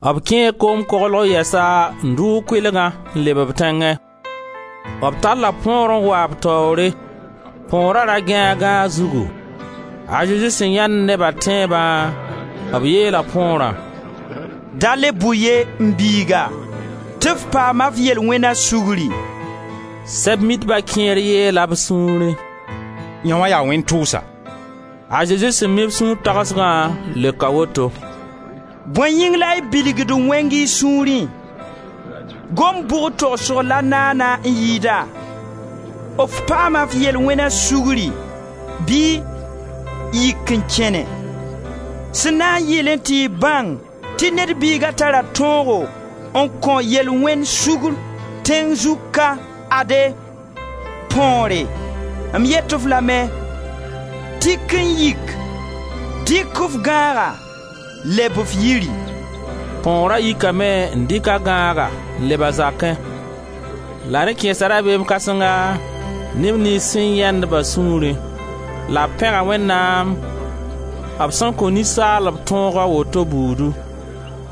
B kẽe koom koglg yɛsa n dʋʋg kʋɩlgã n leb b tẽngẽ. B talla põor n wa b taoore. Põora da gãe a gãag zugu. A Zezi sẽn yãend neba tẽebã, b yeela põorã: «Da le bʋ ye, m biiga, tɩ f paama f yel-wẽna sugri.» Sɛb-mitba kẽer yeela b sũurẽ: «Yãoã yaa wẽn-tʋʋsa.» A Zezi sẽn mi b sũur tagsgã leoka woto: «Bõe yĩng la y bilgd wẽng y sũurẽ? Gomd bʋg togsg la naana n yɩɩda: f paama f yel-wẽna sugri, bɩ: yik n kẽne? Sẽn na n yɩlẽ tɩ y bãng tɩ Ned Biiga tara tõog n kõ yel-wẽnd sugr, tẽng zug ka, ade, põore, m yet-f lame: tik n yik, dɩk f gãaga, leb f yiri!» Põora yikame n dɩk a gãaga n leb a zakẽ. La rẽ kẽesa rabeem kãsenga neb niyns sẽn yãend-ba sũurẽ, la b pẽga Wẽnnaam b sẽn kõ ninsaalb tõog a woto buudu.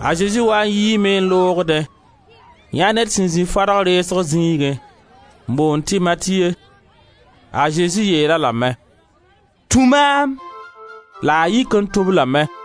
A Zezi waa n yiime n loogdẽ, n yãe ned sẽn zĩ fadg reesg zĩigẽ, n boond tɩ Matiye. A Zezi yeel-a lame: «Tũ maam!» La a yik n tũ-b lame.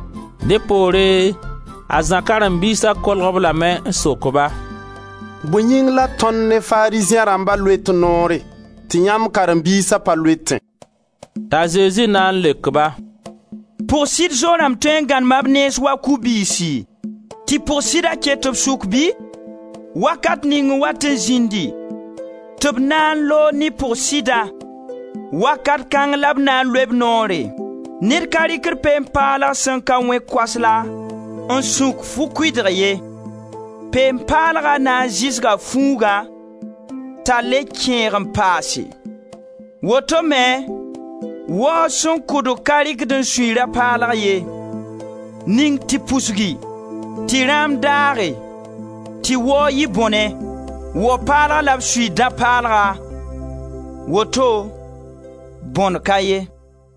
Dẽ poore a Zã karen-biisa kolg-b lame n sok-ba: «Bõe yĩng la tõnd ne Farizẽ rãmba loet noore tɩ yãmb karen-biisa pa loetẽ?» T'a Zezi na n leok-ba: «Pʋg sɩd zo-rãmb tõe n gãnema b nens wa ku-biisi tɩ pʋg-sɩda ket b sʋk bɩ? Wakat ning n wat n zĩndi tɩ b na n loog ne pʋg-sɩdã, wakat kãng la b na n loe b noore.» Ned ka rɩkd peen-paalg sẽn ka wẽ koasla n sũk fu-kʋɩdg ye. Peen-paalga na n zɩsga fuugã t'a le kẽeg n paase. Woto me waoog sẽn kʋdg ka rɩkd n sui dã-paalg ye. Ning tɩ pusgi, tɩ rãam daage, tɩ waoog yɩ bõne. Wao-paalg la b suiid dã-paalga, woto bõne ka ye.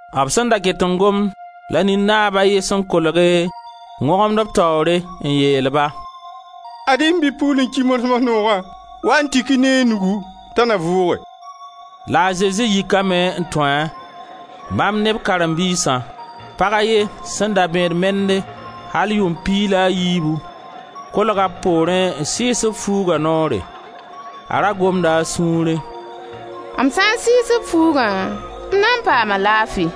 B sẽn da ket n gomd la nin-naab a ye sẽn kolge n wõgemd b taoore n yeel-ba: «Ad-y m bi-pugl n ki mars-mars noogã, wa-y n tik-a ne y nugu t'a na vʋʋge.» La a Zezi yikame n tũ-a, bãmb ne b karen-biisã. Pag a ye sẽn da bẽed mende al yʋʋm piig la a yiibu, kolga b poorẽ n sɩɩs b fuuga noore. A ra gomda a sũurẽ: «M sã n sɩɩs b fuugã, m na n paama laafi.»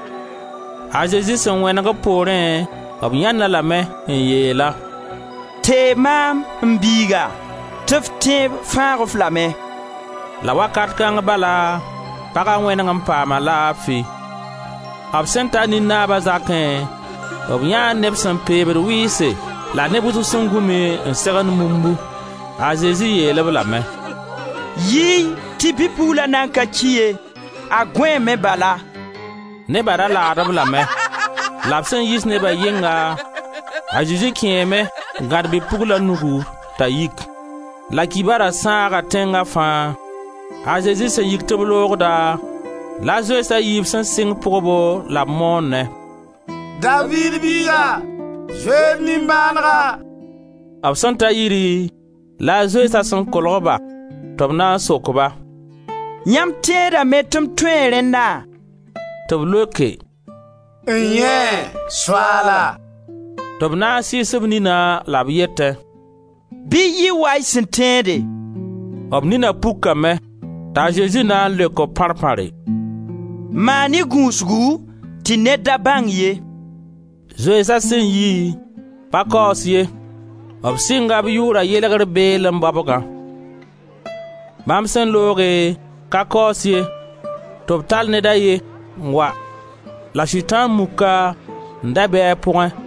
A Zezi sẽn wẽneg b poorẽ b yãend-a lame n yeel-a: «Teeg maam, m biiga, tɩ f tẽeb fãag-f lame.» La wakat kãng bala paga wẽneg n paama laafi. B sẽn ta nin-naaba zakẽ, b yãee neb sẽn peeb-d wɩɩse la neb wʋsg sẽn gũmi, tɩ zak wulumdi. A Zezi yeel-b lame: «Yi-y tɩ bi-pugla nan ka ki ye, a gõeeme bala. Neba da laad-b lame.» La b sẽn yiis neba yɩnga, a Zezi kẽeme n gãd bi-pugla nugu, t'a yik. La kibara sãaga tẽnga fãa. A Zezi sẽn yik tɩ b loogda, la zoeens a yiib sẽn sɩng pʋgbo la b moonẽ: «Daviid biiga, zoe-y d nimbãanega!» B sẽn ta yiri, la zoeensã sẽn kolg-ba tɩ b na n sok-ba: «Yãmb tẽedame tɩ m tõe rẽnna?» Tɩ b leoke: «N-yẽe, Soaala!» Tɩ b na n sɩɩs b nina la b yetẽ: «Bɩ yɩ wa y sẽn tẽede!» B nina pukame. T'a Zezi na n leok-b pãr pãre: «Maan-y gũusgu, tɩ ned da bãng ye!» Zoeensa sẽn yi, pa kaoos ye, b sɩnga b yʋʋra yelegr beelẽ baobgã. Bãmb sẽn looge, ka kaoos ye, tɩ b tall ned a ye n wa la Sʋtãan-muk n da be a pʋgẽ.